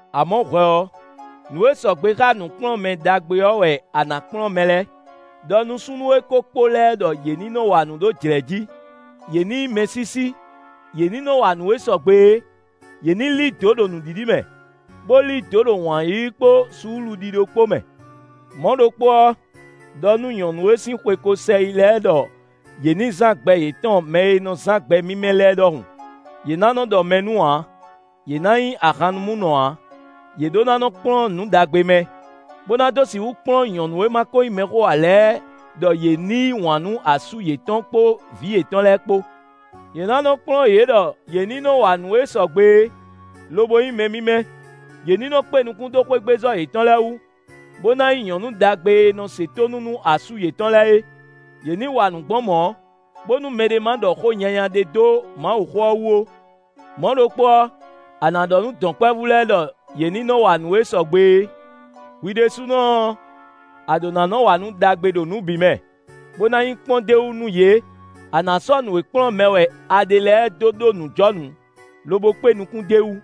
Amɔ̌ hwɛ ɔ́, nǔ e sɔgbe xá nǔkplɔ́nmɛ ɖagbe ɔ́ wɛ a nǎ kplɔ́n mɛ lɛ́ɛ; ɖɔ nú súnnu e ko kpo lɛ́ɛ ɖɔ yě ní nɔ wa nǔ ɖó jlɛ̌ jí; yě ní nyí mɛsísí; yě ní nɔ wa nǔ e sɔgbe é; yě ní lí dǒ ɖo nǔɖiɖi mɛ, bó lí dǒ ɖo wǎn yíyí kpó suúluɖíɖó kpó mɛ. Mɔ̌ ɖokpó ɔ́, ɖɔ nú nyɔ̌nu e sín xwe ko sɛ yi lɛ́ɛ ɖɔ yě ní zán gbɛ yětɔn mɛ e nɔ zán gbɛ mímɛ́ lɛ́ɛ ɖɔhun. Yě ná nɔ́ ɖɔ mɛ nu ǎ; yě ná nyí ahannumúnɔ ǎ; yě ɖó ná nɔ́ kplɔ́n nǔ ɖagbe mɛ, bó ná dó sixú kplɔ́n nyɔ̌nu e ma ko nyí mɛxó ǎ lɛ́ɛ ɖɔ yě ní yí wǎn nú asú yětɔn kpó vǐ yětɔn lɛ́ɛ kpó. Yě ná nɔ kplɔ́n yě ɖɔ yě ní nɔ wa nǔ e sɔgbe é, lobo nyí mɛ mímɛ́; yě ní nɔ́ kpé nukún dó xwégbezɔ́ yětɔn lɛ́ɛ wú, bó ná nyí nyɔ̌nu ɖagbe e nɔ se tónú nú asú yětɔn lɛ́ɛ é; yě ní wa nǔ gbɔn mɔ̌, bónú mɛɖé ma ɖɔ xó nyanya ɖé dó Mawuxó ɔ́ wú ó. Mɔ̌ ɖokpó ɔ́, a nǎ ɖɔ nú dɔ̌nkpɛvú lɛ́ɛ ɖɔ yě ní nɔ wa nǔ e sɔgbe é. Hwi ɖésúnɔ ɔ́, a ɖǒ ná nɔ́ wa nǔ ɖagbe ɖo nǔ bǐ mɛ, bó ná nyí kpɔ́n d'é wú nú yě; a nǎ sɔ́ nǔ e kplɔ́n mɛ wɛ a ɖe lɛ́ɛ dó ɖó nǔjɔnǔ, lobo kpé nukún d'é wú.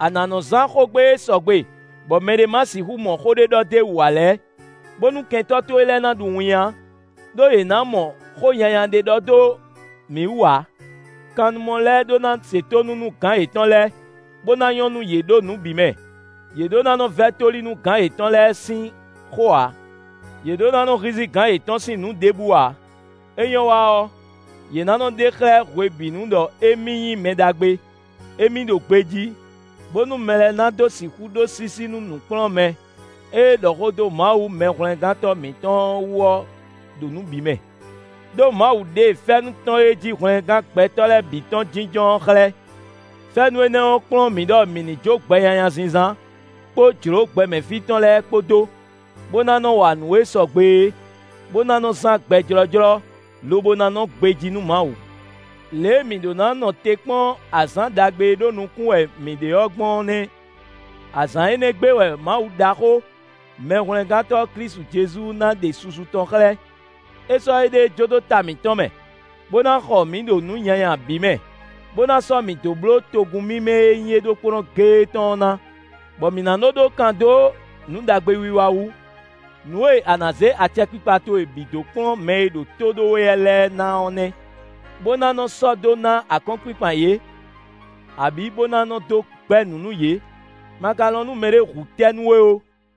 A nǎ nɔ zán xógbe e sɔgbe bɔ mɛɖé ma ná sixú mɔ xó ɖé ɖɔ d'é wú ǎ lɛ́ɛ, bónú kɛntɔ́ towe lɛ́ɛ ná ɖu winnyá, ɖó yě ná mɔ xó nyanya ɖé ɖɔ dó mǐ wú ǎ. Kannumɔ lɛ́ɛ ɖó ná se tónú nú gǎn yětɔn lɛ́ɛ, bó ná nyɔ́ nú yě ɖo nǔ bǐ mɛ; yě ɖó ná nɔ vɛ́ tóli nú gǎn yětɔn lɛ́ɛ sín xó ǎ. Yě ɖó ná nɔ́ hízí gǎn yětɔn sín nǔ ɖěbǔ ǎ; é nyɔ́ wa ɔ́, yě ná nɔ́ ɖe xlɛ́ hwebǐnu ɖɔ émí nyí mɛ ɖagbe; émí ɖo gbejí, bónú mɛ lɛ́ɛ ná dó sixú ɖó sísí nú nǔkplɔ́nmɛ e ɖɔ xó dó Mawu Mɛhwlɛ́ngántɔ́ mǐtɔn wú ɔ́ ɖo nǔ bǐ mɛ. Đó Mawu ɖe fɛ́nú tɔn e jí hwlɛngán gbɛtɔ́ lɛ́ɛ bǐ tɔn jínjɔ́n ɔ́ xlɛ́. Fɛ́nú énɛ́ ɔ́ kplɔ́n mǐ ɖɔ mǐ ní jó gbɛ nyanya zínzán kpó jlǒ gbɛmɛ fí tɔn lɛ́ɛ kpó dó, bó ná nɔ́ wa nǔ e sɔgbe é, bó ná nɔ́ zán gbɛ jlɔ́jlɔ́, lobo ná nɔ́ gbejí nú Mawu. Lě e mǐ ɖó ná nɔ te kpɔ́n azǎn ɖagbe e ɖó nukún wɛ mǐ ɖe ɔ́ gbɔn ɔ́ nɛ́; azǎn énɛ́ gbe wɛ Mawu ɖaxó, Mɛhwlɛ́ngántɔ́ Klísu Jezu ná ɖe susu tɔn xlɛ́. É sɔ́ éɖée jó dó ta mǐtɔn mɛ, bó ná xɔ mǐ ɖo nǔ nyanya bǐ mɛ, bó ná sɔ́ mǐ dó bló togun mímɛ́ e nyí é ɖokpónɔ géé tɔn ɔ́ ná, bɔ mǐ ná nɔ́ ɖó kan dó nǔ ɖagbe wiwa wú. Nǔ e a nǎ zé acɛkpikpa towe bǐ dó kplɔ́n mɛ e ɖo tó ɖó we wɛ lɛ́ɛ ná ɔ́ nɛ́, bó ná nɔ́ sɔ́ dó ná akɔ́nkpinkpan yě, abǐ bó ná nɔ́ dó gbɛ́ nǔ nú yě. Ma ka lɔn nú mɛɖé hu tɛ́ nú we ó.